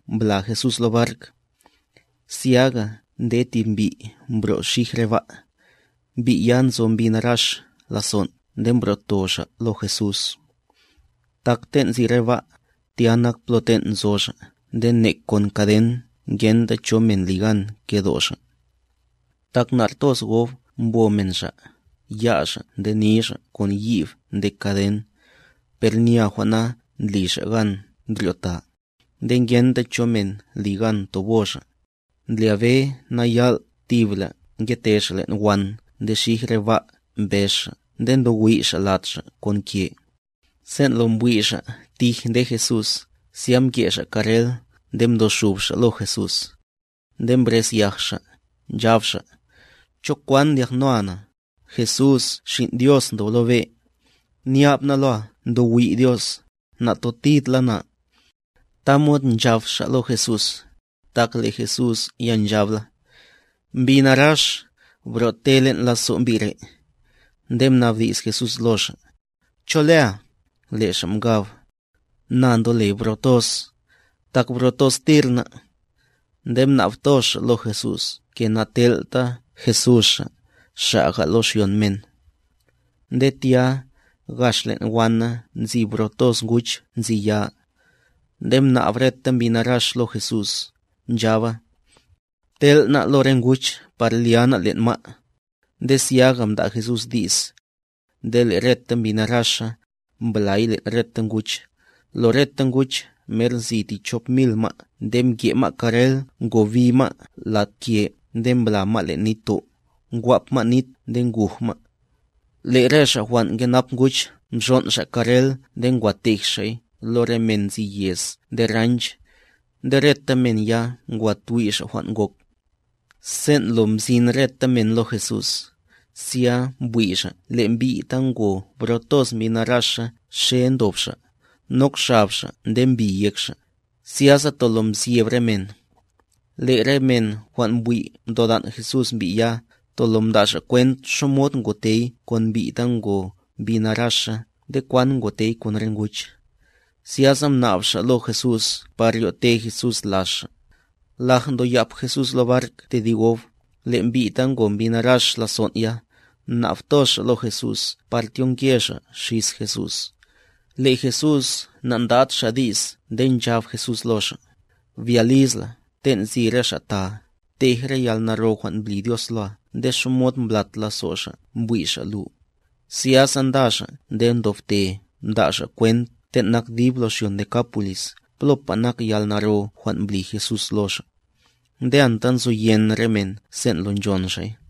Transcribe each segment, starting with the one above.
tya mbla Jesús lo bark. Zyaga nde tib mbi' mbro' xij re ba', mbi' ya nzo mbi narax lazon' nde mbro'to xa' lo Jesús. Tak ten' nzi re ba', tya nak plo ten' nzo xa' nde nek kon kaden ngenta cho men li gan kedo' xa'. Tak nar toz gob mbo men xa', ya' xa' nde ni xa' kon yib nde kaden, per nya jwan' na ndli xa' gan ndryo'ta; nde ngenta cho men li gan tobo xa'. Ndlyabe na yal' tibla ngete xa' len' wan nde xij re ba' mbez xa' nde ntowiy' xa' lad xa' kon ke. Sen' lo mbwi' xa' tij nde Jesús, zya mke xa' karrel nde mdo xub xa' lo Jesús. Nde mbrezyaj xa', nchab xa': —¿Cho kwan ndyaknoa na, Jesús, Xin' Dios ndob lo be'? Nyab na loa ndo wi' Dios, natotid la na. Tamod nchab xa' lo Jesús, tak le' Jesús ya nchab la: —Mbi narax, bro'te len' lazo' mbi' re'. Nde mnabdi's Jesús lo xa': —¿Cho lea? Le' xa' mkab: —Na ndole Bro toz;a Tak bro toztir ná'. Nde mnab toz xa' lo Jesús ke natel'ta Jesús xa', xa'ga lo xyon men. Nde tya, gax len' wana nzi bro toz nguch nzi ya. Nde mnab reta mbi narax lo Jesús, nchaba: —Btel' ná' lo re nguch par lya ná' len' ma'. Nde zyaga mda' Jesús di's. Nde le' reta mbi naraxa, mblay len' reta nguch, lo reta nguch mer nzi ti chop mil ma' nde mke ma' karrel ngobi ma' lad ke nde mbla ma' len' nitto', ngwap ma' nit nde nguj ma'. Le' re xa' jwan' nkenap nguch mxon' xa' karrel nde ngwa tej xa'y lo re men nzi yez nde ranch. Nde reta men ya ngwa twi' xa' jwan' ngok. Sen' lo mzin reta men lo Jesús, zya mbwi' xa' le' mbi' ta ngo bro toz mbi naraxa xe ndob xa', nok xab xa' nde mbi yek xa', zyasa tolo mzyeb re men. Le' re men jwan' mbwi' mtodan' Jesús mbi' ya, tolo mda' xa' kwent xamod ngotey kon mbi' ta ngo mbi naraxa nde kwan ngotey kon re nguch. Zyasa mnab xa' lo Jesús par ryo'te Jesús laz xa'. Laj ndoyap Jesús lo bark tedib gob, le' mbi' ta ngo mbi narax lazon' ya, mnab toz xa' lo Jesús par tyonke xa' xis Jesús. Le' Jesús nandad Xa' di's nde nchab Jesús lo xa': —Bya liz la, ten' nzi re xa' taa, ptej re yalnaro jwan' mbli Dios loa nde xamod mblat lazo' Xa' mbwi' Xa' lu. Zyasa nda xa' nde mdobte mda' xa' kwent ten' nak dib lo xyon Decápolisb plopa nak yalnaro jwan' mbli Jesús lo xa'. Nde anta nzoyen re men sen' lo nchon xa'y.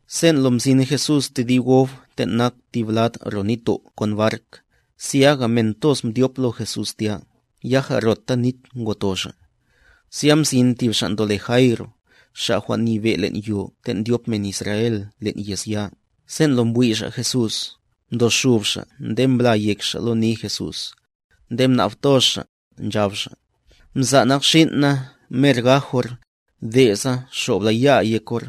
Sen' lo mzin Jesús tedib gob ten' nak tib lad ro nitto' kon bark, zyaga men toz mdyop lo Jesús tya, yaja rota nit ngoto Xa'. Zya mzin tib xa' ndole Jaíro, xa' jwan' nyebe' len' yo ten' ndyop men Israel len' yez ya, sen' lo mbwi' xa' Jesús, mdo xub xa' nde mbla yek xa' lo ni Jesús. Nde mnab toz xa', nchab xa': —Mza' nak xin' na mer gaj or; de' sa xob la ya'a yek or,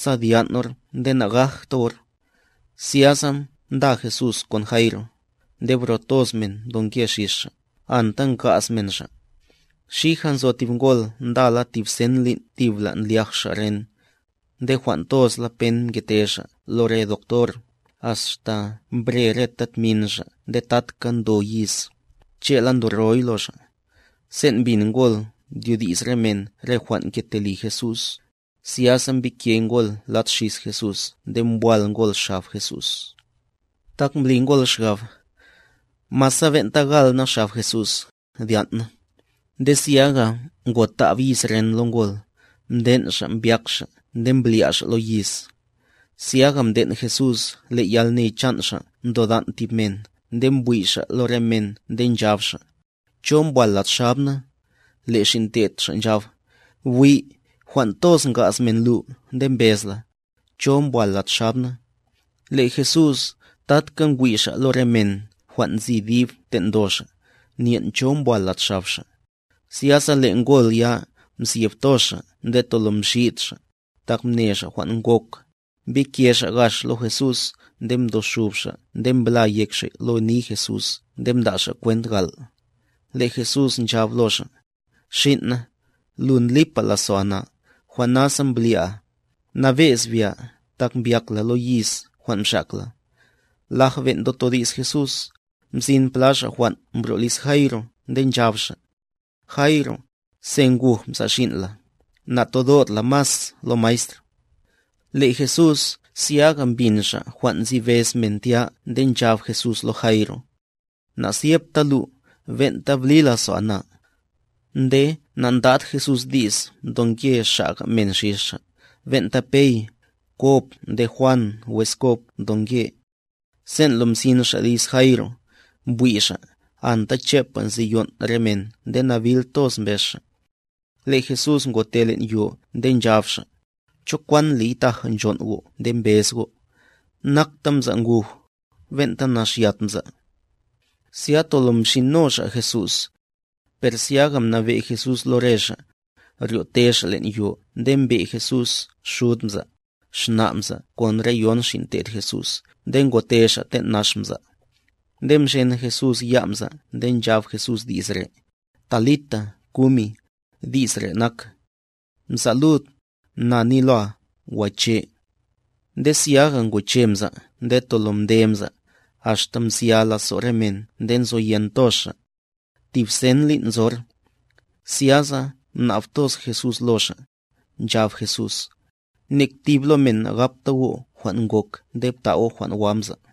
sa dyan' or nde nagajta or. Zyasa nda Jesús kon Jaíro; nde bro toz men mdonke xis Xa', anta nga'z men Xa'. Xija nzo tib ngol ndala tib sen lin' thibla' ndlyaj xa' ren. Nde jwan' tozla pen mkete xa' lo re doctor, axta mbre reta tmin xa' nde tatka ndo yiz, che'la ndoroy lo xa'. Sen' mbin ngol ndyodi's re men re jwan' nkete li Jesús, zyasa mbike ngol lad xis Jesús nde mbwal ngol xab Jesús, tak mbli ngol xgab: “Masa ben'ta gal na xab Jesús, dyan' na.” Nde zyaga ngotab yiz ren lo ngol, mden' xa' mbyak xa' nde mblya' xa' lo yiz. Zyaga mden' Jesús le' yalne chan' Xa' mtodan' tib men nde mbwi' Xa' lo re men nde nchab Xa': —¿Cho mbwal lad xab na? Le' xin' te'd Xa' nchab: —Bwi', jwan' toz nga'z men lu nde mbez la: “¿Cho mbwal lad xab na?” Le' Jesús tatka ngwi' Xa' lo re men jwan' nzi dib ten' ndo Xa', nyen' cho mbwal lad xab Xa'. Zyasa le' ngol ya, mzyeb toz xa' nde tolo mxid xa', tak mne xa' jwan' ngok, mbike xa' gax lo Jesús nde mdo xub xa' nde mbla yek xa' lo ni Jesús nde mda' xa' kwent gal'. Le' Jesús nchab lo xa': —Xin' na, lu ndlipa lazo'a na, jwan' nasa mblya'a; nabe'z bya tak mbyak la lo yiz jwan' mxak la. Laj ben' ndotodi's Jesús, mzin pla xa' jwan' mbro' liz Jaíro nde nchab xa': —Jaíro, se nguj mza' xin' la; natodot la mas lo maestr. Le' Jesús zyaga mbin Xa' jwan' nzi bez men tya nde nchab Jesús lo Jaíro: —Nazyebta lu, ben'ta bli lazo'a na. Nde na'ndad Jesús di's ndonke xa'ga men xis Xa', ben'ta Pey, Kob nde Juan wes Kob mdonke. Sen' lo mzin xa' liz Jaíro, mbwi' xa', anta chepa nzi yon' re men nde nabil toz mbez xa'. Le' Jesús ngote len' yo nde nchab Xa': —¿Cho kwan ndliy taja nchon' go' nde mbez go'? Nakta mza' nguj, ben'ta naxyat mza'. Zya tolo mxino xa' Jesús. Per zyaga mnabe' Jesús lo re xa', ryo'te xa' len' yo nde mbe' Jesús xud mza', xna' mza' kon re yon xin' te'd Jesús nde ngote xa' ten' nax mza'. Nde mxen Jesús ya' mza' nde nchab Jesús di's re': —Talita kumic —di's re' nak: ¡Mza' lud, na ni loa, goche'! Nde zyaga ngoche mza' nde tolo mde mza', axta mzya lazo' re men nde nzoyen toz xa'. Tib sen lin' nzor. Zyasa mnab toz Jesús lo xa', nchab Jesús: —Nek tib lo men nagapta go' jwan' ngok nde pta' go' jwan' wa mza'.